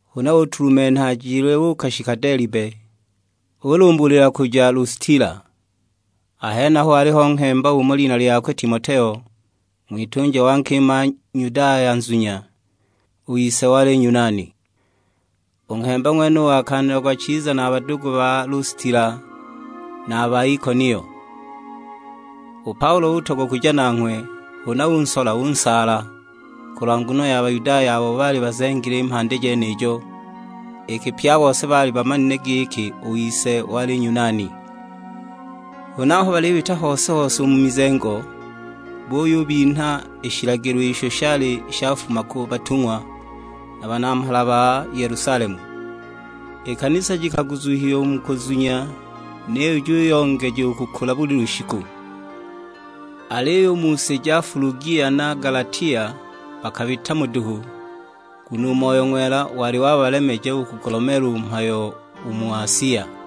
Huna utulumenha ajile uukashika Delibe, ulumbulila kuja Lustila; a henaho waliho nghemba umo lina lyakwe Timoteo, ng'witunja wa nkima Nyudaya nzunya, u ise wali Nyunani. U nghemba ng'wenuyo wakaanilagwa chiza na a badugu ba Lustila, na a ba Ikonio. U Paulo utogwa kuja nanghwe, huna unsola unsaala, kulwa nguno ya Bayudaya abo baali bazengile i mhandi jenijo, iki pye a bose baali bamanile giki u ise wali Nyunani. Huna aho balibita hose-hose u mu mizengo, buyubinha i shilagilo isho shali shafuma ku batung'wa na banamhala ba Yelusalemu. I kanisa jikaguzuhiwa u mu kuzunya, niyo juyongeja u kukula buli lushiku. Aliyo u mu si ja Fulugia na Galatia bakabita mo duhu, nguno u Moyo Ng'wela wali wabalemeja u kugulomeela u mhayo u mu Asia.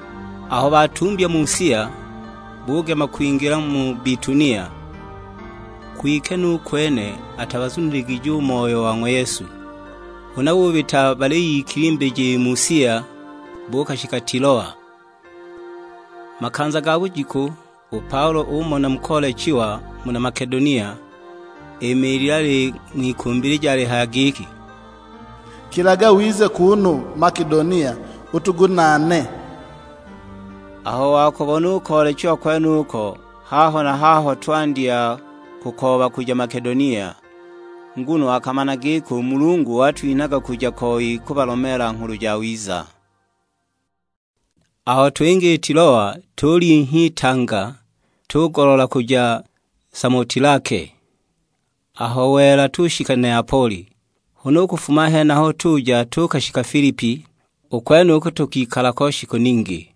Aho batumbya Musia, bugema kwingila mu Bitunia, kwike nu kwene atabazuniligije u Moyo wa ng'wa Yesu. Huna bubita baliyikilimbija i Musia, buukashika Tiloa. Makanza ga bujiku u Paulo umona mu koolechiwa, muna Makedonia; imiilile aling'wikumbilija alihaya giki, "Kilaga wize kuunu Makedonia utugunaane!" Aho wakubona u koolechiwa kwenuko, haho na haho twandya kukooba kuja Makedonia, nguno akamana giki u Mulungu watwitanaga kuja koi kubalomeela Nghulu Jawiza. Aho twinga i Tiloa tulinhya itanga, tugoloola kuja Samotilake; aho wela tushika Neapoli. Huna u kufuma a henaho tuja tuukashika Filipi, u kwenuko tukikala ko shiku ningi.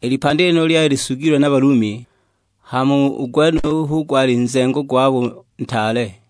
I lipandi lyenilo lyali lisugilwe na Balumi, hama u gwenuyo hu gwali nzengo gwabo ntaale.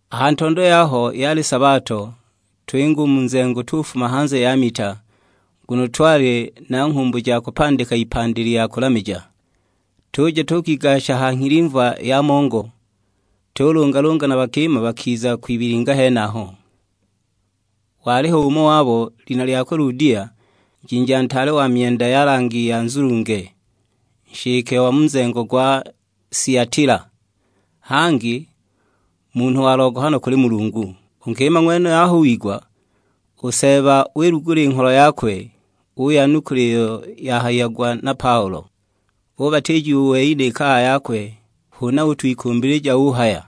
A ha ntondo yaho yali sabato, twinga u mu nzengo tufuma hanze ya mita, nguno twali na nghumbu ja kupandika ipandi lya kulamija. Tuja tuukigasha ha nghilimva ya mongo, tulungalunga na bakima bakiza kwibilinga henaho. Waliho umo wabo, lina lyakwe Ludia, njinja ntaale wa myenda ya langi ya nzulunge, nshike wa mu nzengo gwa Siatila, hangi munhu wa logohano kuli Mulungu. U nkima ng'wenuyo aho wigwa, u Seeba wilugula i ngholo yakwe, uyanukula iyo yahayiagwa na Paulo. Ubatiijiwa u wei, ni kaya yakwe; huna utwikumbilija uhaya,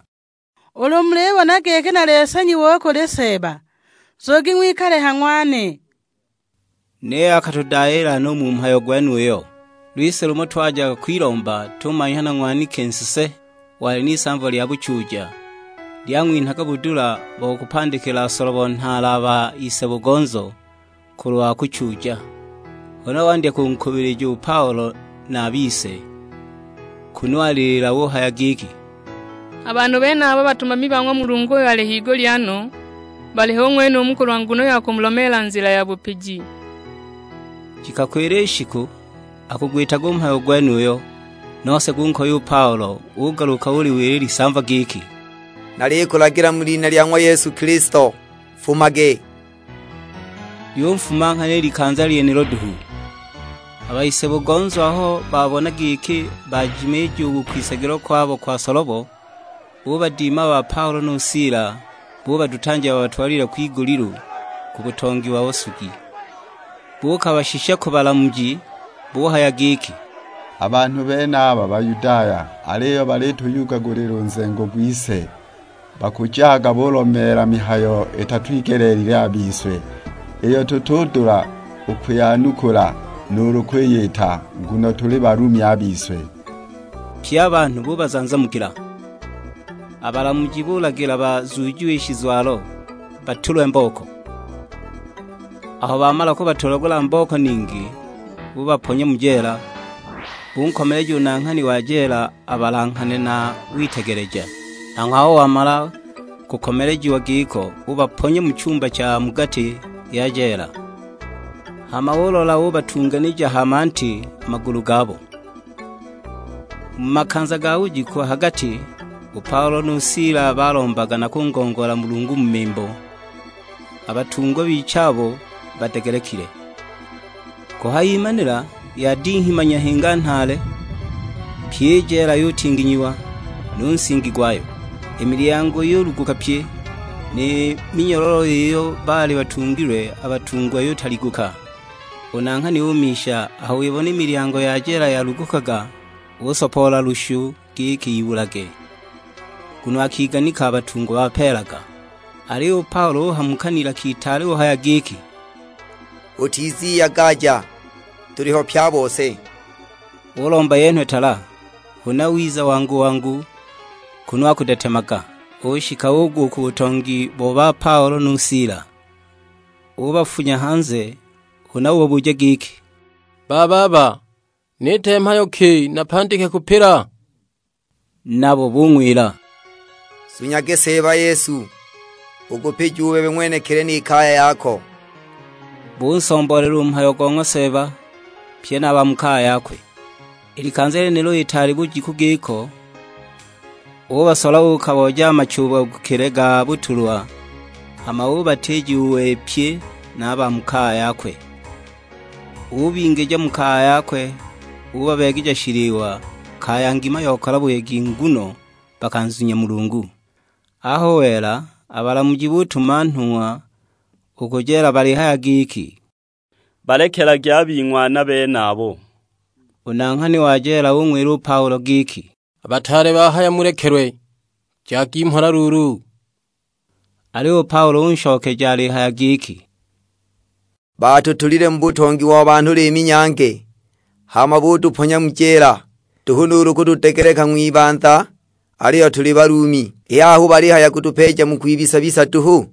"Ulu mulibona giki nali nsanyiwa u kuli Seeba, nzugi ng'wikale ha ng'wane." Niyo akatudayiila no u mu mhayo gwenuyo! Lwise lumo twajaga kwilomba, tumanhya na ng'waniki nsese, wali n'isamva lya buchuuja, lyang'winhaga budula bo kubapandikila solobo nhaale a ba ise-bugonzo kulwa kuchuuja. Huna wandya kunkuubilija u Paulo na a bise, kunu alilila uhaya giki, "A banhu benaba batumami ba ng'wa Mulungu uyo ali higulya no, baliho u ng'wenumu kulwa nguno ya kumulomeela nzila ya bupiji." Jikakwila i shiku akugwitaga u mhayo gwenuyu, nose gunkoya u Paulo; ugaluka uliwila i lisamva giki, "Nalikulagila mu lina lya ng'wa Yesu Kilisto, nfumage!" Lyunfuma nghana i likanza lyenilo duhu. A ba ise-bugonzo aho babona giki bajimiija u kwisagilwa kwabo kwa solobo, bubadima a ba Paulo nu Sila, bubadutanja babatwalile kwigulilu, ku butongi bo basugi. Buukabashisha ku balamuji, buhaya giki, "A banhu benaba Bayudaya, aliyo balituyugagulila u nzengo gwise. Bakujaga bulomeela mihayo itatwigeleelilwe a bise, iyo tutudula u kwiyanukula nuulu kwiyita, nguno tuli Balumi a bise!" Pye a banhu bubazanzamukila. A balamuji bulagila bazuujiwe i shizwalo, batulwe mbooko. Aho bamala kubatulagula mbooko ningi, bubaponya mu jeela; bunkomeleja u nanghani wa jeela abalanghane na witegeleja. Nanghwe aho wamala kukomelejiwa giko ubaponya mu chumba sha mu gati ya jeela, hama ulola ubatunganija ha manti a magulu gabo. Mu makanza ga bujiku ha gati, u Paulo nu Sila balombaga na kungongoola Mulungu mu mimbo; a batungwa bichabo badegelekile. Kuhayimanila yadinghima nyahinga nhaale; pyi i jeela yutinginyiwa, nu nsingi gwayo. I milyango yuluguka pye, ni minyololo iyo baali batungilwe a batungwa yutaliguka. U nanghani umisha, aho wibona i milyango ya jeela yalugukaga, usopoola lushu giki ibulage, nguno akiganika a batungwa bapeelaga. Aliyo u Paulo uhamuka n'ilaka itaale uhaya giki, "Utiziyagaja, tuliho pye a bose!" Ulomba yenhwe tala, huna wiza wangu-wangu kunu akudetemaga, ushika ugwa u ku butongi bo ba Paulo nu Sila. Ubafunya hanze; huna ubabuja giki, "Bababa, niite mhayo ki napandike kupila?" Nabo bung'wila, "Nzunyage Seeba Yesu, ukupijiwa u bebe ng'wenekili ni kaya yako!" Bunsomboolela u mhayo go ng'wa Seeba, pye na a ba mu kaya yakwe. I likanza lyenilo itaali bujiku giko, ubasola uukabooja a machubagukile ga butulwa, hama ubatiijiwa u wei pye na a ba mu kaya yakwe. Ubingija mu kaya yakwe ubabeegeja shiliwa; kaya ngima yokala buyegi nguno bakanzunya Mulungu. Aho wela, a balamuji butuma nhung'wa u ku jeela balihaya giki, "Balekelagi a bing'wana benabo." U nanghani wa jeela ung'wila u Paulo giki, "A bataale bahaya mulekelwe; jagi mhola luulu!" Aliyo u Paulo unshokeja alihaya giki, "Baatutulile mu butongi wa banhu liimi-nyange, hama butuponya mu jeela, nduhu nuulu kutudegeleka ng'wibanza aliyo tuli Balumi, i haha hu balihaya kutupeeja mu kwibisa-bisa duhu?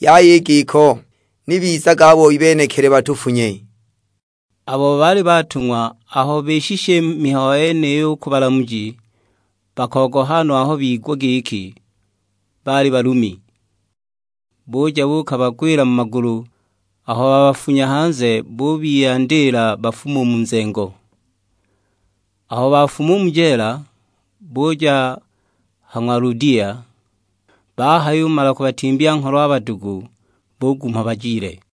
Yaya i giko, ni bizage a boi benekili batufunye!" Abo baali batung'wa aho bishisha i mihayo yeniyo u ku balamuji, bakogoha no aho bigwa giki baali Balumi. Buja buukabagwila mu magulu; aho babafunya hanze bubiyandiila bafume u mu nzengo. Aho bafuma u mu jeela, buja ha ng'wa Ludia; bahayumala kubatimbya ngholo a badugu, bugumha bajile.